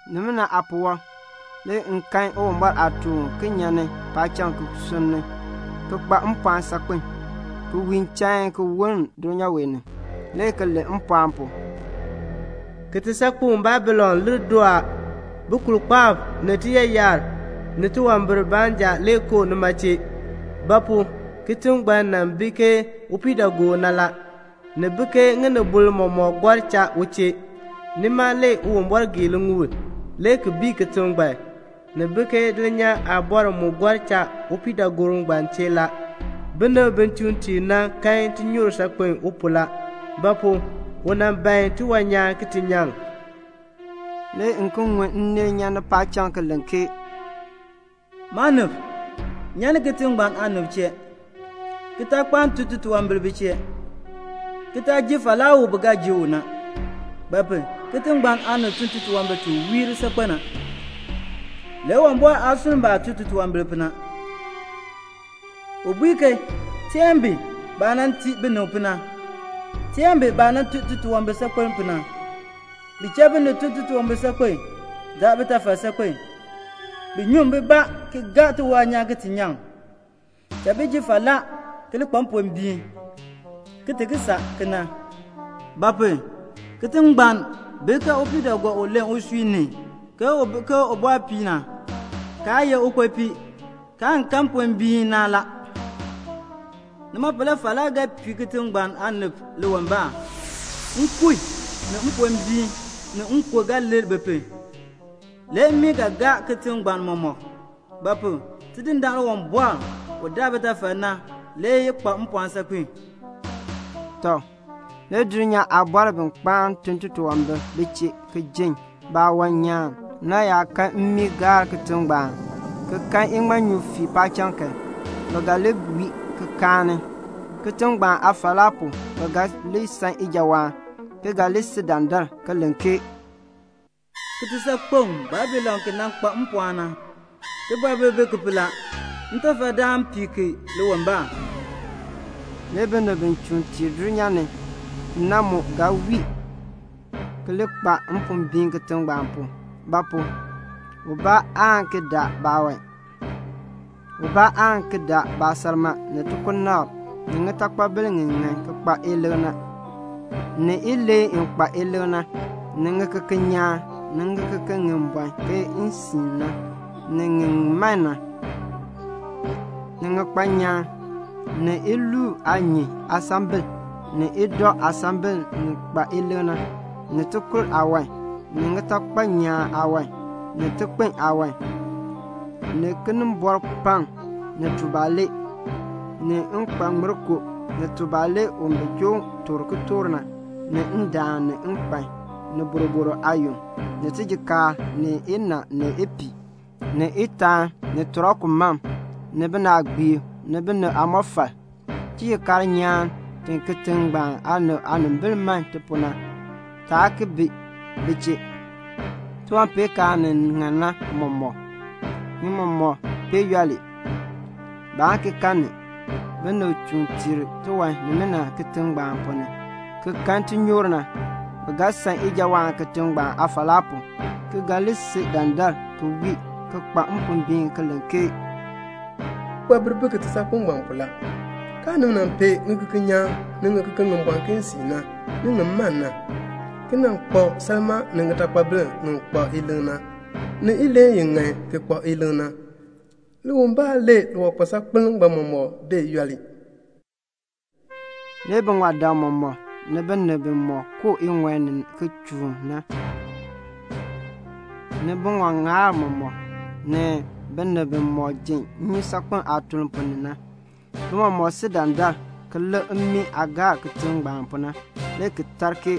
Nimina aapuwɔb, le m kan Uwumbɔr aatuun uken nyan paacham ki sunni, ki kpa mpɔɔn saakpen, ki wiin chain ki woln dulnyaa wee ni, le ki len mpɔɔn pu, "Kitisaakpeŋ Babilon lir doo a. Bukulkpaab ni tiyaayar ni tiwambir baanja le koo nima chee; ba pu? kitiŋ ngbaan nan bi ke upiidaagoor na. Ni bi ke ŋinibol mɔmɔk gɔr cha u chee. Nima le Uwumbɔr gee liŋuul, le ki bii kitiŋ ngbaan. Ni bi ke dulnyaa aabɔrb mu gɔr cha upiidaagoor ngbaan chee la. Binib bi chuun tiir na kan tinyoor saakpen u pu la; ba pu? u nan ban tiwan nyaan ki ti nyaŋ." Le m ki ŋun nneel nyan paacham ki len ke "Maanib, nyan ni kitiŋ ngbaan aanib chee, ki taa kpaan tun titunwambir bi chee, ki taa ji falaa u bi ga ji u na; ba pu? kitiŋ ngbaan aanib tun titunwambir ti wiir saakpen na, le Uwumbɔr aa sunn baah tun titunwambir pu na. U bui ke 'Giin ki tii bi baah nan tii binib pu na. Teen bi baah tun titunwambir saakpen pu na. Bi cha binib tun titunwambir saakpen. Daan bitafal saakpen. Bi nyuŋ bibaa ki gaa tiwan nyaan ki ti nyaŋ. Cha bi ji falaa ki li kpa mpombiin ki ti ki saa kena;' ba pu? kitiŋ ngbaan bi ke upiidaagoor u len usui ni ke u bi ke ubɔrpii na, kaa ye ukpopii, kaan kan mpombiin. Nima pu na le falaa ga pii kitiŋ ngbaan aanib liwimbaan. Nkun, ni mpombiin, ni nkon ga lir bi pu. Le mmii ga gaa kitiŋ ngbaan mɔmɔk; ba pu? Tidindaan Uwumbɔr u daa bitafal na le kpa mpɔɔn saakpen." Tɔ, le dulnyaa aabɔrb bi kpaan tun titunwambir bi chee ki jin baawan nyaan na, bi yaa kan mmii gaar kitiŋ ngbaan, ki kan iŋmanyu fii paacham kan, bi ga li wii ki kaani. Kitiŋ ngbaan aafalaa pu bi ga li san ijawaan, ki ga li si dandar, ki len ke "Kitisaakpeŋ Babilon ki nan kpa mpɔɔn na, tibɔbil bi ki pu la. Ntafadaan pii ki liwimbaan." Le binib bi chuun tiir dulnyaa ni na mu ga wii ki kpa mpombiin kitiŋ ngbaan pu; ba pu? ubaa aa ki daa baawan. Ubaa aa ki daa baasalmaa, ni aansilfa, ni ŋitakpabil ŋi ŋan ki kpa ilik na, ni ileen i kpa ilik na, ni ŋikeken nyaan, ni ŋikeken ŋi bɔn ke nsiin na, ni ŋi man na, ni ŋikpan nyaan, ni iluub aanyin aasambil, ni idɔ aasambil ŋi kpa ilik na, ni tikur aawan, ni ŋitakpal nyaan aawan, ni tikpin aawan, ni kinimbɔrpaŋ, ni tubalee, ni nkpaŋmirkoo, ni tubalee u bi joo toor kitork na, ni ndaan, ni nkpan, ni boroboro aayon, ni tijikaar, ni inaa, ni ipiih, ni itaan, ni tɔriku mam, ni binaagbiib, ni binib aamɔfal. Tijikaar nyaan ti kitiŋ ngbaan aanib aanimbil man ti pu na, taa ki bi bi chee. Tiwanpeenkaan ni ŋan na mɔmɔk, ni mɔmɔk bee yooli. Baan ki kan ni. Binib bi chuun tiir tiwan nimina kitiŋ ngbaan ponn ni ki kan tinyoor na, bi ga san ijawaan kitiŋ ngbaan aafalaa pu, ki ga li si dandar ki wii ki kpa mpombiin ki len ke "Tibɔbil bi kitisaakpeŋ ngbaan pu la. Kaanib nan pee ŋikeken nyaan, ni ŋikeken ŋi bɔn ke nsiin na, ni ŋi man na, ki nan kpa salmaa ni ŋitakpabil ŋi ŋan ki kpa ilik na, ni ileen i ŋan ki kpa ilik na. Liwimbaan le liwankpal saakpeln ngbaan mɔmɔk bee yooli." Le biŋɔdam mɔmɔk, ni binib bimɔk koo iŋɔi ni ki chuun na, ni biŋɔŋaab mɔmɔk, ni binib bimɔk ji nnyusaakpem aatuln ponn ni na, bi mɔmɔk si dandar ki lik mmii aah gaar kitiŋ ngbaan pu na, le ki tar ke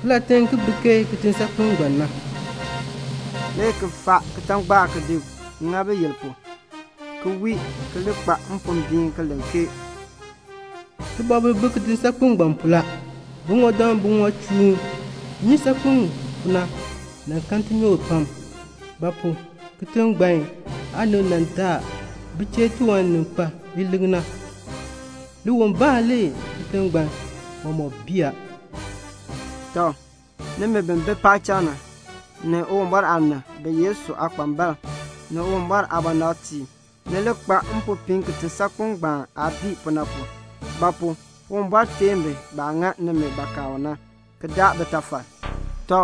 "Kilatiŋ bi ke kitisaakpeŋ ngbaan na?" le ki faa kitangbaak ki di ŋa biyil pu, ki wii ki kpa mpombiin ki len ke "Tibɔbil bi kitisaakpeŋ ngbaan pu la. Biŋɔdam bimɔk chuun nnyusaakpem pu na nan kan tinyoor pam; ba pu? kitiŋ ngbaan aanib daa bi chee tiwan ni kpa ilik na. Liwimbaan le kitiŋ ngbaan mɔmɔk bii a." Tɔ, nimi bi bi paacham na, ni Uwumbɔr aanib, ni Yesu aakpambalb, ni Uwumbɔr aabɔnabtiib, ni li kpa mpopiin kitisaakpeŋ ngbaan aah bii pu na; ba pu? Uwumbɔr teen bi baah ŋa nimi bakaa u na, ki daa bitafal. Tɔ,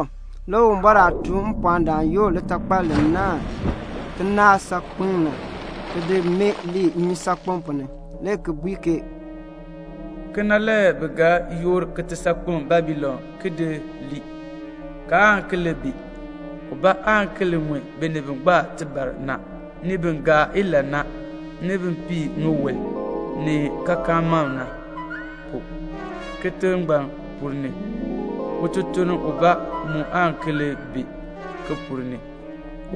le Uwumbɔr aatuun mpɔɔndaan yoor litakpal li naahn kinaak saakpeŋ na, ki di mee nnyusaakpem ponn ni, le ki bui ke "Kena le bi ga yoor kitisaakpeŋ Babilon ki lii. Kaan ki li bi. Ubaa aan ki li ŋun binib bi gbaa tibar na, ni bin gaa ilahn na, ni bin pii ŋiwul ni kaakaan mam na, kitiŋ ngbaan ponn ni. Ututuln ubaa mu aan ki li bi ki ponn ni.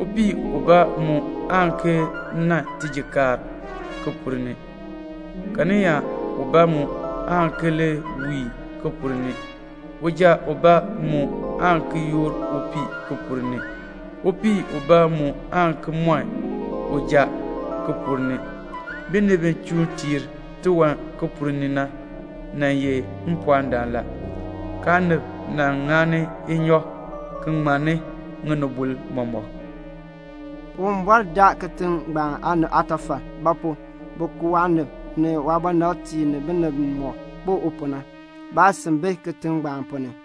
Upii ubaa mu aan ki nan tijikaar ki ponn ni. Karyaa ubaa mu aan ki li wiin ki ponn ni. Uja ubaa mu aan ki yoor upii ki ponn ni. Upii ubaa mu aan ki mɔn uja ki ponn ni. Binib bi chuun tiir tiwan ki ponn ni na nan ye mpɔɔndam la. Kaanib nan ŋani inyɔk ki ŋmanni ŋinibol mɔmɔk." Uwumbɔr daa kitiŋ ngbaan aanib aatafal; ba pu? bi ku waanib ni waabɔnabtiib ni binib bimɔk kpo u pu na. Baasin bi kitiŋ ngbaan ponn ni.